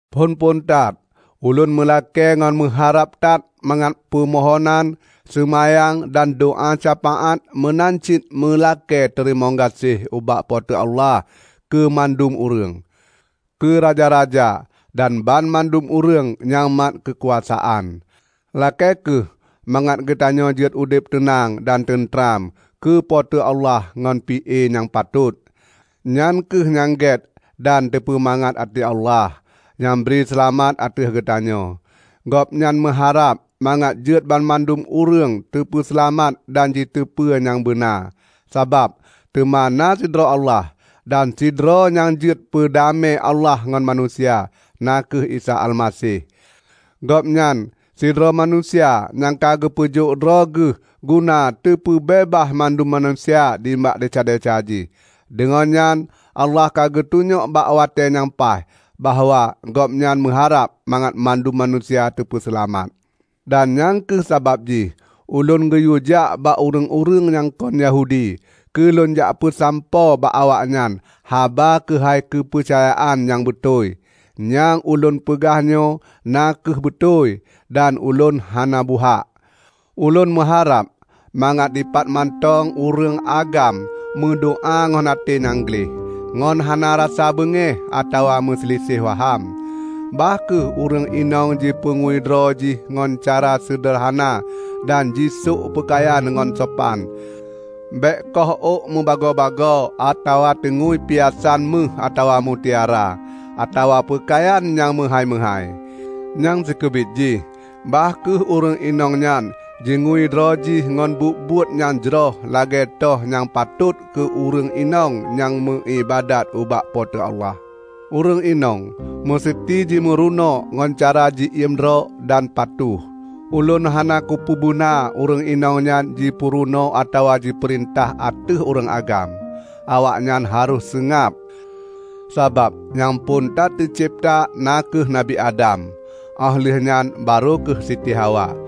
Phon-phon that, ulôn meulakée ngon meuharab that mangat peumohonan, seumayang, dan doá syafaát meunan cit meulakée teurimong gaséh ubak Po teu Allah keumandum ureuëng; keuraja-raja dan banmandum ureuëng nyang mat keukuasaan. Lakée kheueh mangat geutanyoe jeuet udeb teunang dan teuntram keu Po teu Allah ngon pi-e nyang patot. Nyan kheueh nyang gét dan teupeumangat até Allah, nyang bri seulamat ateueh geutanyoe. Gobnyan meuharab mangat jeuet banmandum ureuëng teupeuseulamat dan jiteupeu nyang beuna. Sabab, teuma na sidroe Allah, dan sidroe nyang jeuet peudamé Allah ngon manusia, na kheueh Isa Almaseh. Gobnyan sidroe manusia nyang ka geupeujok droe Geuh guna teupeubeubaih mandum manusia nibak desya-desya jih. Deungon nyan Allah ka geutunyok bak watée nyang paih, bahwa Gobnyan meuharab mangat mandum manusia teupeuseulamat. Dan nyang kheueh sabab jih ulôn geuyuejak bak ureuëng-ureuëng nyang kon Yahudi keu lôn jak peusampoe bak awaknyan haba keuhai keupeucayaan nyang beutôi. Nyang ulôn peugah nyoe na kheueh beutôi dan ulôn hana buhak. Ulôn meuharab mangat dipat mantong ureuëng agam meudoá ngon até nyang gleh, ngon hana rasa beungéh atawa meusiliseh waham. Bah kheueh ureuëng inong jipeungui droe jih ngon cara seudeurhana dan jisôk peukayan nyang sopan. Bék koh ôk mubagoe-bagoe atawa teungui piasan méuh atawa mutiara, atawa peukayan nyang meuhái-meuhái. Nyang sikeubiet jih, bah kheueh ureuëng inong nyan jingui droe jih ngon buet-buet nyang jroh lagée toh nyang patot keu ureuëng inong nyang meuiébadat ubak Po teu Allah. Ureuëng inong meuseuti jimurunoe ngon cara ji-iem droe dan patuh. Ulôn hana kupeubeuna ureuëng inong nyan jipeurunoe atawa jipeurintah ateueh ureuëng agam; awaknyan harôh seungab. Sabab nyang phon that teucebta na kheueh Nabi Adam óh lheueh nyan barô kheueh Siti Hawa.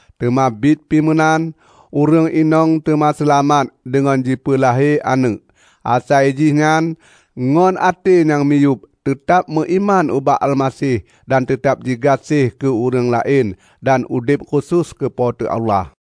Teuma biet pi meunan, ureuëng inong teuma seulamat deungon jipeulahé aneuëk, asai jihnyan ngon até nyang miyueb teutab meuiman ubak Almaseh dan teutab jigaséh keu ureuëng laén dan udeb khusos keu Po teu Allah.